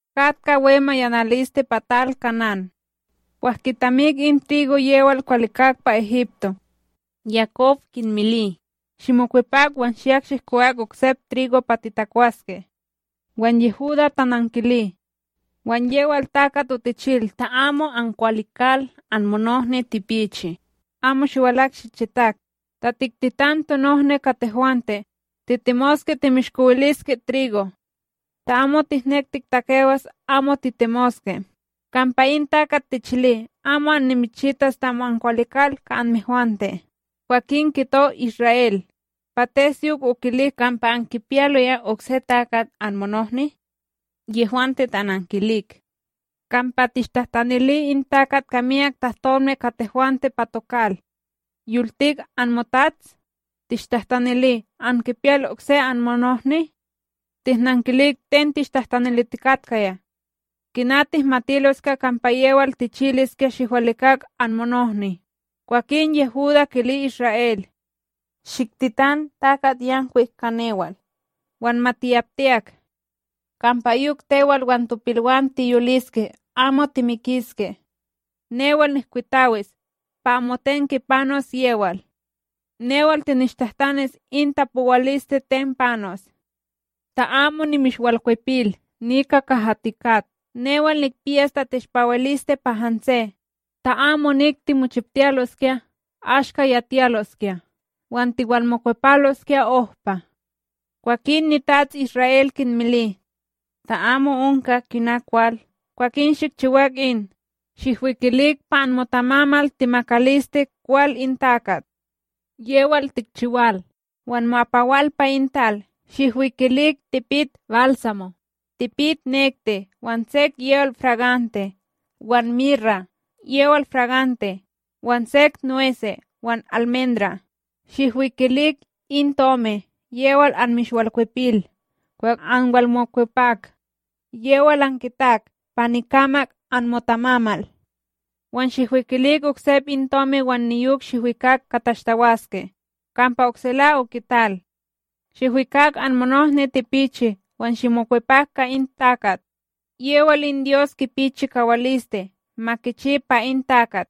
Katka we mayanaliste pa tal Kanán. Kwah kitamik in trigo yewal kiwalikak pa Egipto. Yakob kinmili: ―Shimokwepak, wan shiyak shihkowak oksep trigo pa titakwaske. Wan Yehudá tanankili: ―Wan yewal takat otichil ta amo ankwalikal anmonohni tipichi, amo shiwalak shichitak. Ta tiktitan tonohni ka tehwante, titemoske timishkowiliske trigo. Ta amo tihnek tiktakewas amo titemoske. Kampa in takat tichili amo annimichitas ta amo ankwalikal ka anmehwante. Kwakin kito Isra'El: ―Pates yok okilik kampa ankipiyaloya okse takat anmonohni? Yehwante tanankilik: ―Kampa tishtahtanili in takat ka myak tahtolme ka tehwante pa tokal. “Yoltik anmotats? Tishtahtanili: Ankipiyal okse anmonohni?” Tihnankilik ten tishtahtanilitikatkaya. Kina tihmatiloskya kampa yewal tichiliskya shihwalikak anmonohni? Kwakin Yehudá kili Isra'El: ―Shiktitan takatYankwik ka newal wan ma tiyaptiyak, kampa yok tewal wan topilwam tiyoliske amo timikiske. Newal nihkwitawis; pa amoten kipanos yewal. Newal tinishtahtanis in tapowaliste ten panos, ta amo nimishwalkwepil nika kaha tikat, newal nikpiyas tateshpawiliste pa hanse. Ta amo inik timochiptiyaloskya, ashka yatiyaloskya wan tiwalmokwepalosya ohpa! Kwakin nitats Isra'El, kinmili: ―Ta amo onka kina kwal, kwakin shikchiwak in: Shihwikilik pa anmotamamal temakaliste kwal in takat, yewal tikchiwal wan mo'apawal pa in tal, shihwikilik tipit balsamo, tipit nekti, wan sek yewal fragante, wan mira yewal fragante, wan sek nwese', wan almendra'. Shihwikilik in tomi yewal anmishwalkwepil kwah anwalmokwepak, yewal ankitak pa nikamak anmotamamal. Wan shihwikilik oksep in tomi wan niyok shihwikak ka tashtawaske, kampa oksela okital. Shihwikak anmonohni tipichi wan shimokwepak ka in takat. Yewal in Dyos kipi chikawaliste ma kichi pa in takat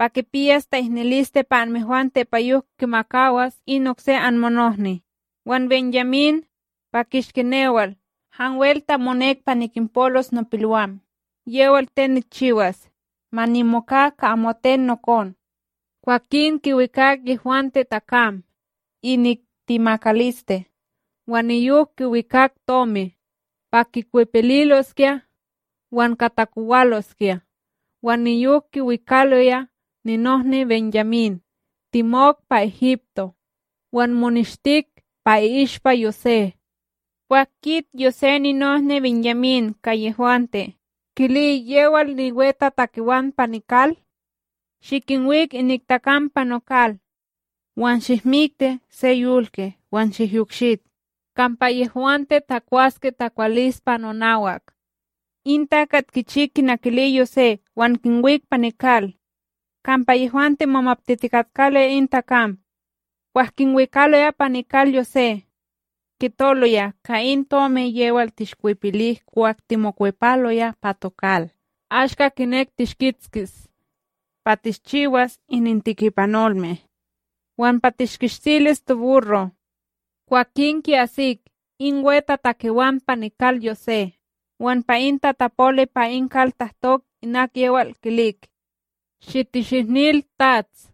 pa kipiyas ta'ihnililiste pa anmehwante pa yok kimakawas in okse anmonohni wan BenYamín! Pa kishki newal, hanwel ta monek pa nikinpolos nopilwam, yewal ten nikchiwas! Ma nimoka ka amoten nokon! Kwakin kiwikak yehwante takam inik temakaliste, wan niyok kiwikak tomi, pa kikwepililoskya wan ka takowaloskya wan niyok kiwikaloya ninohni BenYamín, temok pa Egipto. Wan moneshtik pa i'ishpa Yosé. Kwah kit Yosé ninohni BenYamín ka yehwante, kili yewal niwetatakewan pa nikal: “Shikinwik inik takam pa nokal. Wan shihmikti se yolke wan shikyokshit, kampa yehwante takwaske takwalispa nonawak.” In takat kichi kina kili Yosé wan kinwik pa nikal. Kampa yehwante momaptitikatkaloya in takam kwah kinwikaloya pa nikal Yosé: “Kitoloya ka in tomi yewal tishkwepilik kwah timokwepaloya pa tokal. Ashka kinek tishkitskis, pa tishchiwas inintikipanolme, wan pa tishkishtilis toburro'.” Kwakin ki'asik in wetatakewan pa nikal Yosé, wan pa in tatapoli pa in kal tahtok inak yewal kilik: Shitishihnil, tats: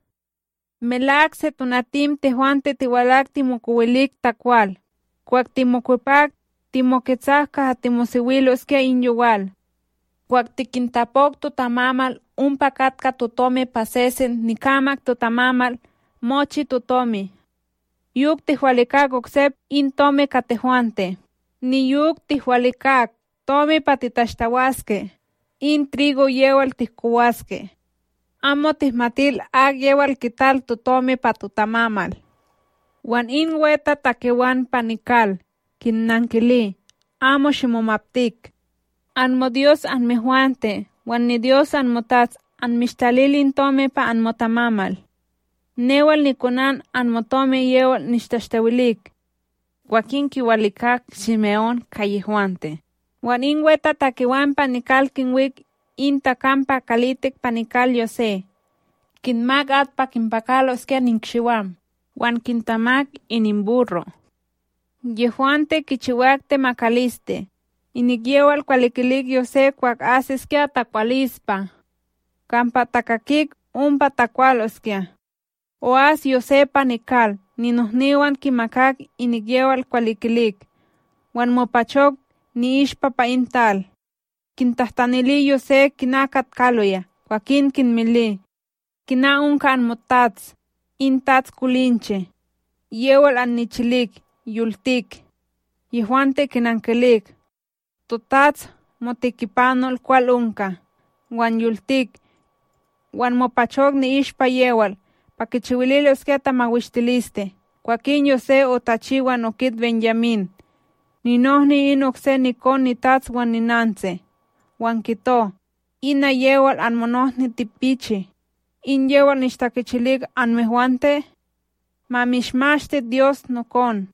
―Melak setonatim tehwante tiwalak timokowilik takwal; kwah timokwepak, timoketsak kaha timosewiloskya in yowal, kwah tikintapok totamamal ompa katka totomi pa sesen nikamak totamamal mochi totomi. Yok tihwalikak oksep in tomi ka tehwante! Niyok tihwalikak tomi pa titashtawaske in trigo yewal tihkowaske. Amo tihmatil akyewal kital totomi pa totamamal! Wan in wetatakewan pa nikal kinnankili: ―Amo shimomaptik. AnmoDyos anmehwante wan niDyos anmotats anmishtalil in tomi pa anmotamamal. Newal nikonan anmotomi yewal nishtashtawilik. Kwakin kiwalikak Shime'ón ka yehwante, wan in wetatakewan pa nikal kinwik in takam pa kalitik pa nikal Yosé. Kinmak at pa kinpakaloskya nikshiwam, wan kintamak ininburro'. Yehwante, kichiwak temakaliste, inik yewal kiwalikilik Yosé kwah asiskya takwalispa, kampa takakik ompa takwaloskya. O'as Yosé pa nikal, ninohniwan kimakak inik yewal kiwalikilik, wan mopachok ni'ishpa pa in tal. Kintahtanili Yosé kina katkaloya, kwakin kinmili: ―Kina onka anmotats, in tats kolinche yewal annichilik? Yoltik? Yehwante kinankilik: ―Totats, motikipanol, kwal onka, wan yoltik. Wan mopachok ni'ishpa yewal pa kichiwililoskya tamawishtiliste. Kwakin Yosé otachi wan okit BenYamín, ninohni in okse nikon nitats wan ninantsi, wan kito: ―In yewal anmonohni tipichi, in yewal nishtakichilik anmehwante? Ma mishmashti Dyos, nokon!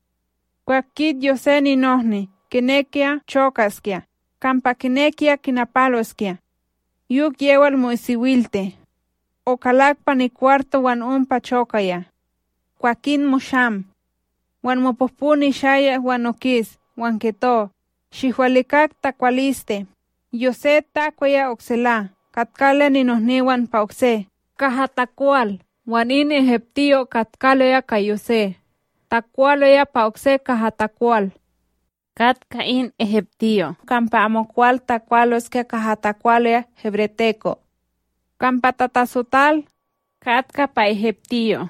Kwah kit Yosé ninohni, kinekiya chokaskya, kampa kinekiya kinapaloskya yok yewal mo'isiwilti. Okalak pa nikwarto wan ompa chokaya. Kwakin mosham, wan mopohpo nishayak wan okis, wan kito: “Shihwalikak takwaliste!” Yosé takwaya oksela, katkaloya ninohniwan pa okse, kaha takwal wan in egiptiyo katkaloya ka Yosé takwaloya pa okse kaha takwal. Katka in egiptiyo' kampa amokwal takwaloskya kaha takwaloya hebreteko', kampa tatatsotal katka pa egiptiyo'.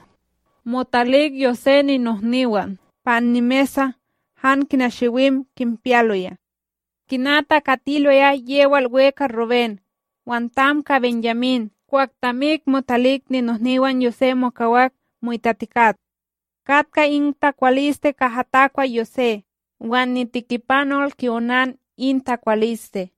Motalik Yosé ninohniwan pa annimesa han kina shiwim kinpiyaloya, kina takatiloya yewal we ka Rubén wan tam ka BenYamín kwah tamik motalik, ninohniwan Yosé mokawak mo'itatikat. Katka in takwaliste kaha takwa Yosé, wan nitikipanol ki'onan in takwaliste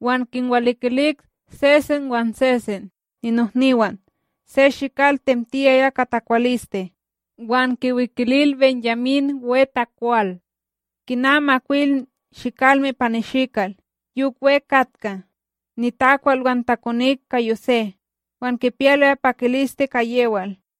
wan kinwalikilik sesen wan sesen ninohniwan se shikal temtiyaya ka takwaliste wan kiwikilil BenYamín we takwal kina makwil shikalme pa nishikal, yok we katka nitakwal. Wan takonik ka Yosé, wan kipiyaloya pakiliste ka yewal.